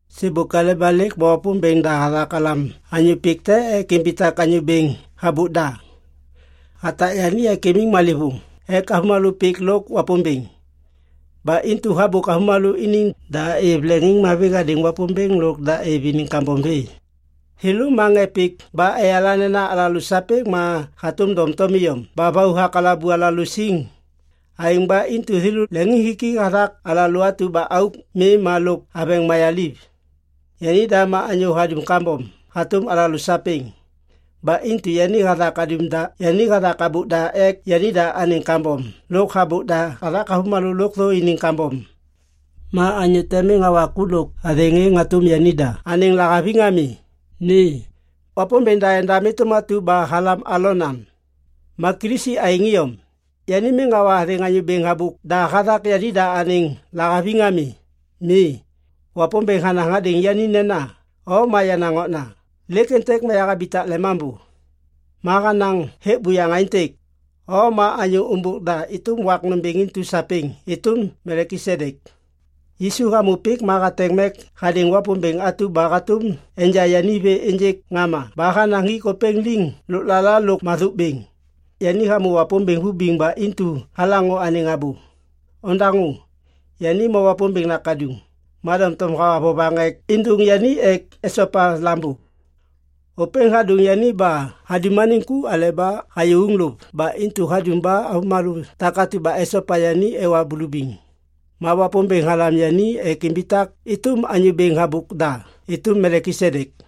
Sêbôk aleba lêk ma Wapômbêŋ da hathak halam anyô pik te ek imbitak anyô bêŋ habôk da. Hatak yani ek imiŋ malêvôŋ ek avômalô pik lôk Wapômbêŋ. Ba intu habôk avômalô iniŋ da êv leŋiŋmavi hadêŋ Wapômbêŋ lôk da êv iniŋ kambom vê. Thêlô ma ŋê pik ba eyala nena alalô sapêŋ ma hatôm doŋtom iyom ba vau hakalabu alalô siŋ. Aêŋ ba intu thêlô leŋiŋhiki hathak alalô atu ba auk mi lôk aveŋ mayaliv. Yanida ma anyô hadum kambom hatôm alalô sapêŋ. Ba intu yani hathak habôk da ek yanida anêŋ kambom lôk habôk da hathak avômalô lôkthô iniŋ kambom. Ma anyô te miŋ hawa ku lôk athêŋ êŋ hatôm yanida anêŋ lahaviŋ ami. Mi. Wapômbêŋ da endam êtôm atu ba halam Alon am. Ma Kilisi aêŋ iyom. Yani miŋ hawa athêŋ anyô bêŋ habôk da hathak yanida anêŋ lahaviŋ ami. Mi. Wapômbêŋ hanaŋ hadêŋ yani nena, “O ma yenaŋ okna, lêk êntêk ma yahabitak lemambô.” Ma hanaŋ hêk buyaŋ aêntêk, “O ma anyô ômbôk da êtôm wak nômbêŋ intu sapêŋ êtôm Melkisedek.” Yisu hamô pik ma hateŋ mek hadêŋ Wapômbêŋ atu ba hatôm enja yani vê ênjêk ŋama ba hanaŋ hik ôpêŋ liŋ lôklala lôk mathôk bêŋ. Yani hamô Wapômbêŋ vibiŋ ba intu halaŋô anêŋ abô. Ondaŋô! Yani ma Wapômbêŋ nakaduŋ. Ma doŋtom hawa vovaŋ ek êndôŋ yani ek esopa lambô. Ôpêŋ hadôŋ yani ba hadum anêŋ ku aleba hayô uŋlôv ba intu hadum ba avômalô takatu ba esopa yani ewa bulubiŋ. Ma Wapômbêŋ halam yani ek imbitak êtôm anyô bêŋ habôk da êtôm Melkisedek.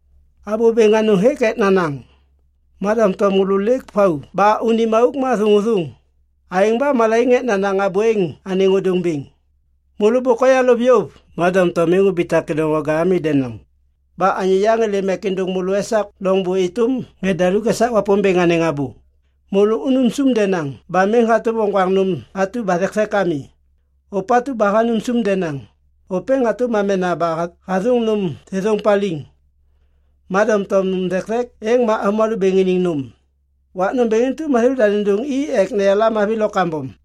Abô bêŋ anôŋ hêk ek nanaŋ. Ma doŋtom môlô lêk vau ba unim auk ma thôŋôthôŋ. Aêŋ ba malaiŋ ek nanaŋ abô êŋ anêŋ ôdôŋ bêŋ. Môlô bôk oyalôv yôv ma doŋtom miŋ ubitak kêdôŋwaga ami denaŋ! Ba anyô yaŋ êlêm ek êndôŋ môlô esak loŋbô êtôm ŋê daluk esak Wapômbêŋ anêŋ abô. Môlô unum sum denaŋ ba miŋ hatôm oŋgwaŋ nôm atu ba thekthek ami. Ôpatu ba hanum sum denaŋ, ôpêŋ hatôm amena ba hathôŋ nôm thêthôŋ paliŋ. Ma doŋtom nôm thekthek êŋ ma avômalô bêŋ iniŋ nôm. Wak nômbêŋ intu ma thêlôda nêndôŋ i ek neyala mavi lo kambom.